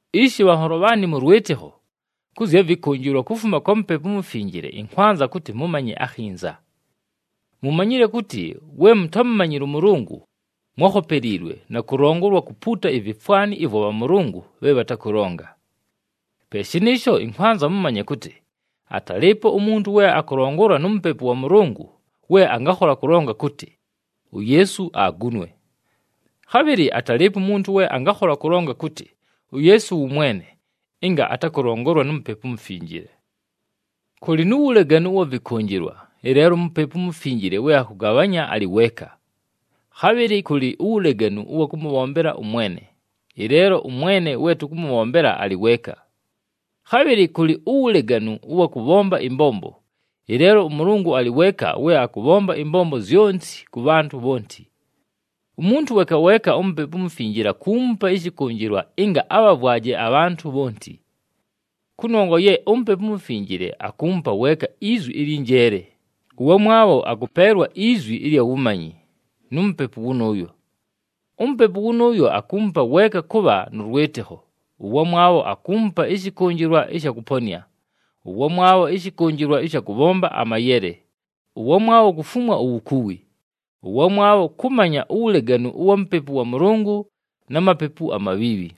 Ishi bhanholo bhaanɨ mʉ lwɨtɨkho, kʉ zya vɨkʉnjɨlwa kufuma kwa Mupepu uMufinjile ɨnkwanza kʉtɨ mʉmanye akhinza. Mumanyile kʉtɨ we mutámumanyile ʉMʉlʉngʉ, mwákhopeliilwe na kʉlongolwa kupuuta ivifwani ɨvwa bhamʉlʉngʉ bhe bhatakʉlonga. Pe shɨnɨɨsho ɨnkwanza mʉmanye kʉtɨ, atalɨɨpo umuntu we akʉlongolwa nu Mupepu wa Mʉlʉngʉ we angakhola kʉlonga kʉtɨ, “UYeesu agunwe.” Khabhɨlɨ atalɨɨpo umuntu we angakhola kʉlonga kʉtɨ, “UYeesu wʉ Mwene,” ɨnga atakʉlongolwa nu Mupepu uMufinjile. Kʉlɨ nu wuleganu ʉwa vɨkʉnjɨlwa, ɨleelo uMupepu uMufinjile we akʉgabhanya alɨ weeka. Khabhɨlɨ kʉlɨ uwuleganu ʉwa kʉmʉbhombela ʉMwene, ɨleelo ʉMwene we tʉkʉmʉbhombela alɨ weeka. Khabhɨlɨ kʉlɨ uwuleganu ʉwa kʉbhomba ɨmbombo, ɨleelo ʉMʉlʉngʉ alɨ weeka we akʉbhomba ɨmbombo zyonti kʉ bhantʉ bhonti. Umuntu weeka weeka uMupepu uMufinjile akuumupa ɨshɨkʉnjɨlwa ɨnga abhavwaje abhantʉ bhonti. Kʉnongwa ye uMupepu uMufinjile akuumupa weeka izwi ɨlyɨ njeele, ʉwamwabho akʉpeelwa izwi ɨlya wumanyi nu Mupepu wʉnʉʉyo. UMupepu wʉnʉʉyo, akuumupa weeka kʉbha nʉ lwɨtɨkho, ʉwamwabho akuumupa ɨshɨkʉnjɨlwa ɨsha kʉponɨa, ʉwamwabho ɨshɨkʉnjɨlwa ɨsha kʉbhomba amayele, ʉwamwabho kufumwa uwukuwi, ʉwamwabho kʉmanya uwuleganu ʉwa Mupepu wa Mʉlʉngʉ na mapepu amabhiibhi,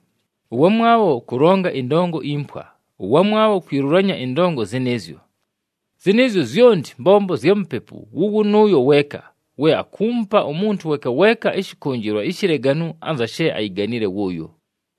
ʉwamwabho kʉlonga ɨndongo impwa, ʉwamwabho kwilulanya ɨndongo zɨnɨɨzyo. Zɨnɨɨzyo zyonti mbombo zya Mupepu wʉ wʉnʉʉyo weeka, we akuumupa umuntu weeka weeka ɨshɨkʉnjɨlwa ishileganu anza she ayiganile wʉʉyo.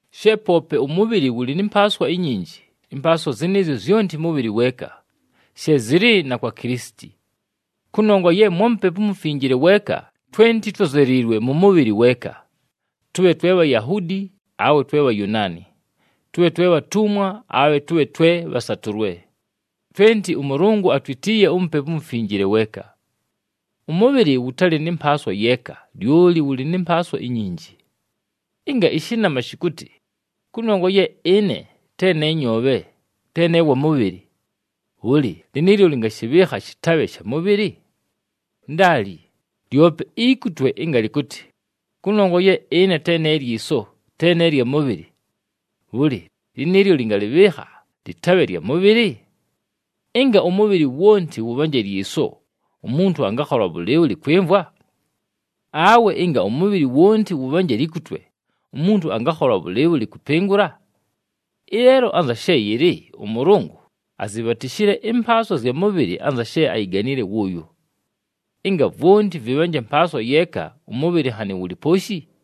She poope ʉmʉbhɨlɨ wʉlɨ nɨ mpaaswa inyinji, ɨmpaaswa zɨnɨɨzyo zyonti mʉbhɨlɨ weeka. She zɨlɨ na kwa Kilisiti. Kʉnongwa ye mwa Mupepu uMufinjile weeka, twenti twózeliilwe mʉ mʉbhɨlɨ weeka. Tʉbhe twe Bhayahuudi awe twe Bhayunaani, tʉbhe twe bhatumwa awe tʉbhe twe bhasatʉlwe, twenti ʉMʉlʉngʉ atwitiiye uMupepu uMufinjile weeka. Ʉmʉbhɨlɨ wʉtalɨ nɨ mpaaswa yeeka, lyoli wʉlɨ nɨ mpaaswa inyinji. Ɨnga ɨshɨnama shɨkʉtɨ, “Kʉnongwa ye ɨne te ne nyoobhe, te ne wa mʉbhɨlɨ,” bhʉlɨ, lɨnɨɨlyo lɨngashɨbhɨɨkha shɨtabhe sha mʉbhɨlɨ? Ndaali. Lyope ikutwe ɨnga lɨkʉtɨ, “Kʉnongwa ye ɨne te ne lyiso, te ne lya mʉbhɨlɨ,” bhʉlɨ, lɨnɨɨlyo lɨngalɨbhɨɨkha lɨtabhe lya mʉbhɨlɨ? Ɨnga ʉmʉbhɨlɨ wonti wʉbhanje lyiso, umuntu angakhola bhʉlɨɨbhʉlɨ kwɨmvwa? Awe ɨnga ʉmʉbhɨlɨ wonti wʉbhanje likutwe, umuntu angakhola bhʉlɨɨbhʉlɨ kʉpɨngʉla? Ɨleelo anza she yɨlɨ ʉMʉlʉngʉ azibhatishile ɨmpaaswa zya mʉbhɨlɨ anza she ayiganile wʉʉyo. Ɨnga vwonti vɨbhanje mpaaswa yeeka, ʉmʉbhɨlɨ nhanɨ wʉlɨ pooshi?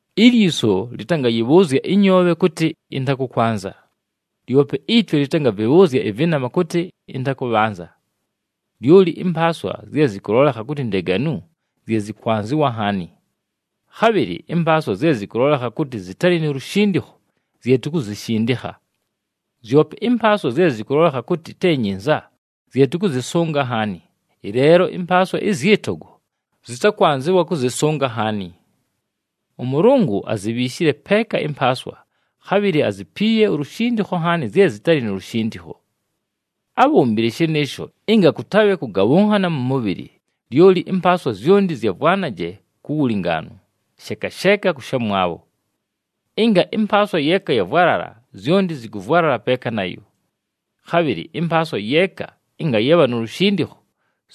Ilyiso lɨtangayɨbhʉʉzya ɨnyoobhe kʉtɨ, “Ɨntakʉkwanza.” Lyope itwe lɨtangavɨbhʉʉzya ɨvɨnama kʉtɨ, “Ɨntakʉbhanza.” Lyoli ɨmpaaswa zye zɨkʉlolekha kʉtɨ ndeganu, zye zɨkwanzɨwa nhaani. Khabhɨlɨ ɨmpaaswa zye zɨkʉlolekha kʉtɨ zɨtalɨ nu lushindikho, zye tukuzishindikha. Zyope ɨmpaaswa zye zɨkʉlolekha kʉtɨ te nyinza, zye tʉkʉzɨsʉnga nhaani, ɨleelo ɨmpaaswa ɨzyɨ togo, zɨtakwanzɨwa kʉzɨsʉnga nhaani. ɄMʉlʉngʉ azibhiishile peeka ɨmpaaswa, khabhɨlɨ azipiiye ulushindikho nhaani zye zɨtalɨ nu lushindikho. Ábhombile shɨnɨɨsho, ɨnga kʉtabhe kʉgabhʉnhana mʉ mʉbhɨlɨ, lyoli ɨmpaaswa zyonti zyavwanaje ku wulingaanu, sheeka sheeka kʉ shamwabho. Ɨnga ɨmpaaswa yeeka yavwalala, zyonti zɨkʉvwalala peeka nayo. Khabhɨlɨ ɨmpaaswa yeeka ɨnga yabha nu lushindikho,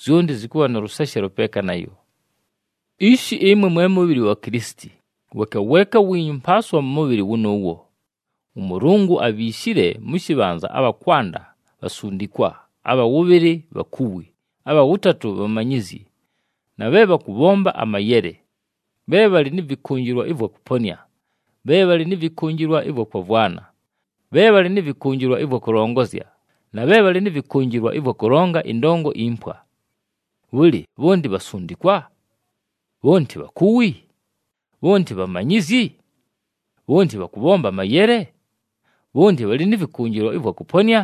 zyonti zɨkʉbha nʉ lʉseshelo peeka nayo. Ishi, ɨmwe mwe mʉbhɨlɨ wa Kilisiti, weeka weeka wiinyu mpaaswa mʉ mʉbhɨlɨ wʉnʉʉwo. ɄMʉlʉngʉ abhiishile mʉ shɨbhanza abha kwanda, bhasundikwa, abha wʉbhɨlɨ bhakuwi, abha wʉtatʉ bhamanyizyi, na bhe bhakʉbhomba amayele, bhe bhalɨ nɨ vɨkʉnjɨlwa ɨvwa kʉponɨa, bhe bhalɨ nɨ vɨkʉnjɨlwa ɨvwa kwavwana, bhe bhalɨ nɨ vɨkʉnjɨlwa ɨvwa kʉlongozya, na bhe bhalɨ nɨ vɨkʉnjɨlwa ɨvwa kʉlonga ɨndongo impwa. Bhʉlɨ, bhonti bhasundikwa? Bhonti bhakuwi? Bhonti bhamanyizyi? Bhonti bhakʉbhomba amayele? Bhonti bhalɨ nɨ vɨkʉnjɨlwa ɨvwa kʉponɨa?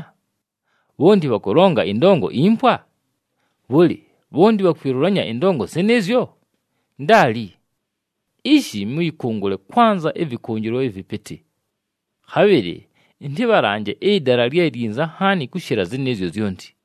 Bhonti bhakʉlonga ɨndongo impwa? Bhʉlɨ, bhonti bhakwilulanya ɨndongo zɨnɨɨzyo? Ndaali! Ishi mʉyɨkʉngʉle kwanza ɨvɨkʉnjɨlwa ɨvɨpɨtɨ. Khabhɨlɨ ɨntɨbhalanje ɨdala lye lyinza nhaani kʉshɨla zɨnɨɨzyo zyonti.